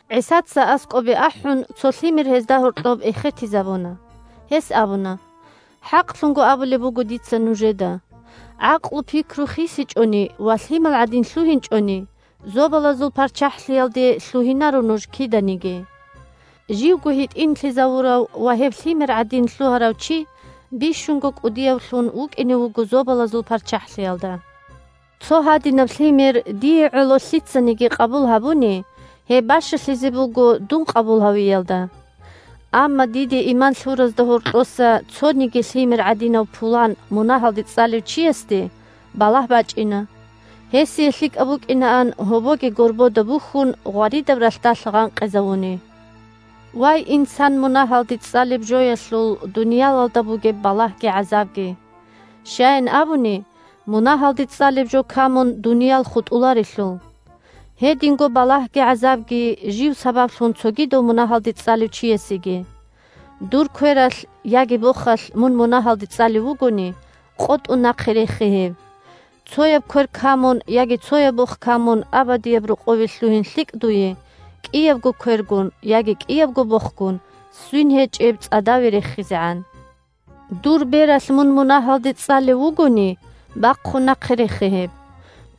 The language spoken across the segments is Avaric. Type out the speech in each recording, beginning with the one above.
ГӀисаца, аскӀобе ахӀун, цо лъимер гьезда гьоркьоб эхетизабуна. Гьес абуна: – ХӀакълъун абулеб буго дица нужеда: гӀакълу-пикру хисичӀони ва лъимал гӀадин лъугьинчӀони, Зобалазул ПарччахӀлъиялде лъугьинаро нуж киданиги. Живго гьитӀинлъизавурав ва гьеб лъимер гӀадин лъугьарав чи бищунго кӀудиявлъун вукӀине вуго Зобалазул ПарччахӀлъиялда. Цо гьадинаб лъимер, дие гӀоло, лъицаниги къабул гьабуни, гьеб бащалъизе буго дун къабул гьавиялда. Амма диде иман лъуразда гьоркьоса цониги лъимер гӀадинав пулан мунагьалде цӀалев чиясде балагь бачӀина. Гьесие лъикӀаб букӀинаан, гьобоги горбода бухьун, гъваридаб ралъдалъ гъанкъизавуни. «Мун мунагьалде цӀалев вугони…» Вай, инсан мунагьалде цӀалеб жоялъул дуниялалда бугеб балагьги гӀазабги! Щаян абуни, мунагьалде цӀалеб жо камун дуниял хутӀуларелъул. Гьединго балагьги гӀазабги жив сабаблъун цогидав мунагьалде цӀалев чиясеги! Дур квералъ, яги бохалъ мун мунагьалде цӀалев вугони, къотӀун нахъе рехе гьеб. Цояб квер камун, яги цояб бох камун абадияб рокъове лъугьин лъикӀ дуе, кӀиябго квергун, яги кӀиябго бохгун свин гьечӀеб цӀадаве рехизегӀан. Дур бералъ мун мунагьалде цӀалев вугони, бахъун нахъе рехе гьеб.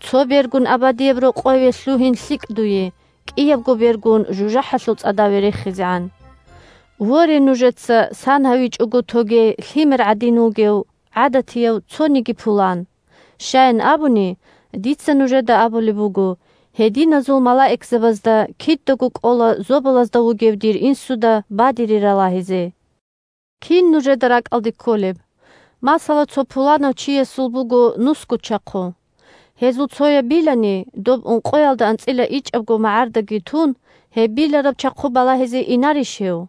Цо бергун абадияб рокъове лъугьин лъикӀ дуе, кӀиябго бергун жужахӀалъул цӀадаве рехизегӀан. Воре, нужеца сан гьавичӀого тоге лъимер гӀадин вугев гӀадатияв цониги пулан. Щаян абуни, дица нужеда абулеб буго: гьединазул малаикзабазда кидаго кӀола зобалазда вугев дир Инсуда бадире ралагьизе. Кин нужеда ракӀалде кколеб: масала, цо пуланав чиясул буго нусго чахъу. Гьезул цояб билани, доб ункъоялда анцӀила ичӀабгоги магӀарда тун, гьеб билараб чахъу балагьизе инарищ гьев?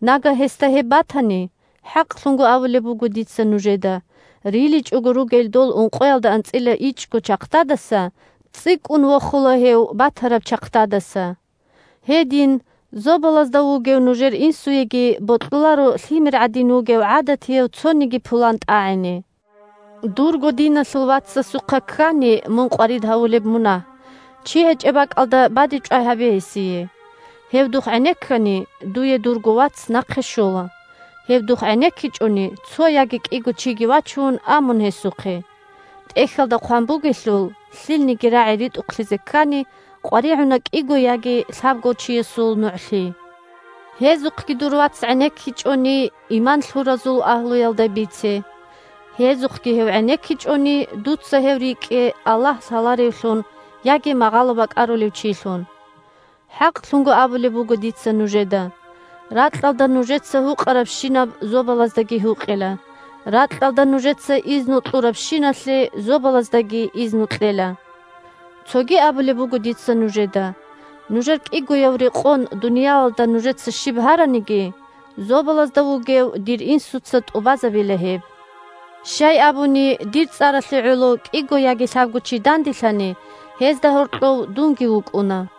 Нагагь гьесда гьеб батани, хӀакълъун абулеб буго дица нужеда, риличӀого ругел дол ункъоялда анцӀила ичӀго чахъдадаса цӀикӀкӀун вохула гьев батараб чахъдадаса. Гьедин зобалазда вугев нужер Инсуеги бокьуларо лъимер гӀадин вугев гӀадатияв цониги пулан тӀагӀине. Дурго диналъул вацасухъа ккани мун къварид гьавулеб мунагь, чи гьечӀеб бакӀалда бадибчӀвай гьабе гьесие. Гьев духъ гӀенеккани, дуе дурго вац нахъе щола. Гьев духъ гӀенеккичӀони, цо яги кӀиго чиги вачун, а мун гьесухъе. ТӀехьалда хъван бугелъул: «Лъилниги рагӀи ритӀухълъизе ккани, къваригӀуна кӀиго яги лъабго чиясул нугӀлъи». Гьезухъги дур вац гӀенеккичӀони, иман лъуразул агьлуялда бице. Гьезухъги гьев гӀенеккичӀони, дуца гьев рикӀкӀе Аллагь лъаларевлъун яги магъало бакӀарулев чилъун. ХӀакълъун абулеб буго дица нужеда: ракьалда нужеца гьукъарабщинаб зобалаздаги гьукъила. Ракьалда нужеца изну кьурабщиналъе зобалаздаги изну кьела. Цоги абулеб буго дица нужеда: нужер кӀигояв рекъон дуниялалда нужеца щиб гьараниги, Зобалазда вугев дир Инсуца тӀубазабила гьеб. Щай абуни, дир цӀаралъе гӀоло кӀиго яги лъабго чи данделъани, гьезда гьоркьов дунги вукӀуна.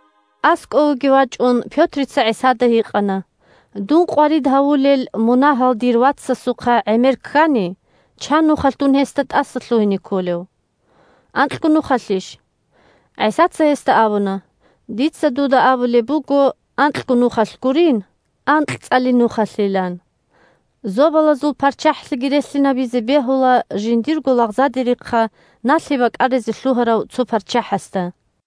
АскӀовеги вачӀун, Пётрица гьикъана ГӀисада: – Дун къварид гьавулел мунагьал дир вацасухъа гӀемер ккани, чан нухалъ дун гьесда тӀасалъугьине кколев? Анкьго нухалъищ? ГӀисаца гьесда абуна: – Дица дуда абулеб буго: анкьго нухалъ гурин, анкьцӀали АнкьцӀали – лъабкъоялда анцӀго. нухалъилан. Зобалазул ПарччахӀлъиги релълъинабизе бегьула жиндирго лагъзадерихъа налъи бакӀаризе лъугьарав цо парччахӀасда.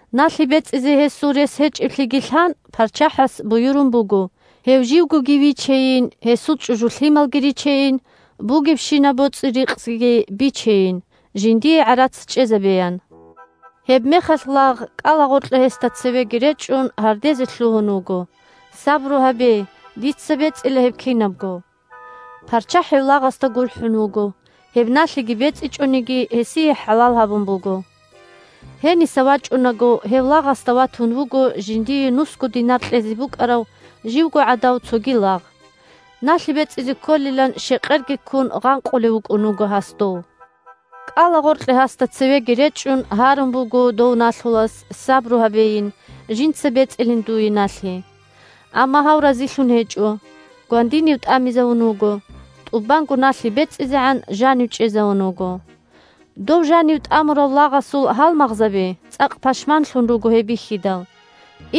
Налъи бецӀизе гьесул рес гьечӀеблъиги лъан, парччахӀас буюрун буго гьев живгоги вичейин, гьесул чӀужу-лъималги ричейин, бугебщинаб боцӀи-рикъзиги бичейин, жиндие гӀарац чӀезабеян. Гьебмехалъ лагъ, кӀалагъоркье гьесда цевеги речӀчӀун, гьардезе лъугьун вуго: – Сабру гьабе! Дица бецӀила гьеб кинабго. ПарччахӀ гьев лагъасда гурхӀун вуго, гьеб налъиги бецӀичӀониги гьесие хӀалал гьабун буго. Гьениса вачӀунаго, гьев лагъасда ватун вуго жиндие нусго динар кьезе букӀарав живгогӀадав цоги лагъ. Налъи бецӀизе кколилан, щекъерги ккун, гъанкъулев вукӀун вуго гьас дов. КӀалагъоркье гьасда цевеги речӀчӀун, гьарун буго дов налъулас, сабру гьабейин, жинца бецӀилин дуе налъи. Амма гьав разилъун гьечӀо, гвандинив тӀамизавун вуго, тӀубанго налъи бецӀизегӀан жанив чӀезавун вуго. Дов жанив тӀамурав лагъасул гьалмагъзаби цӀакъ пашманлъун руго гьеб бихьидал,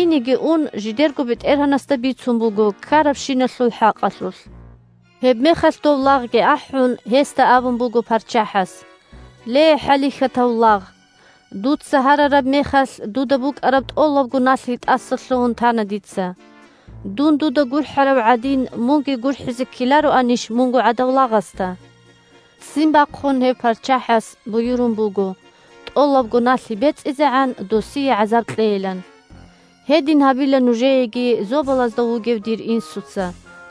инеги ун жидерго бетӀергьанасда бицун буго ккарабщиналъул хӀакъалъулъ. Гьебмехалъ дов лагъги ахӀун, гьесда абун буго парччахӀас: – Ле, хӀалихьатав лагъ, дуца гьарараб мехалъ дуда букӀараб тӀолабго налъи тӀасалъугьун тана дица. Дун дуда гурхӀарав гӀадин, мунги гурхӀизе ккелароанищ мунго гӀадав лагъасда? Ццин бахъун гьев парччахӀас буюрун буго тӀолабго налъи бецӀизегӀан досие гӀазаб кьейилан. Гьедин гьабила нужееги Зобалазда вугев дир Инсуца,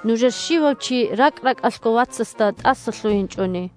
нужер щивав чи ракӀ-ракӀалъго вацасда тӀасалъугьинчӀони.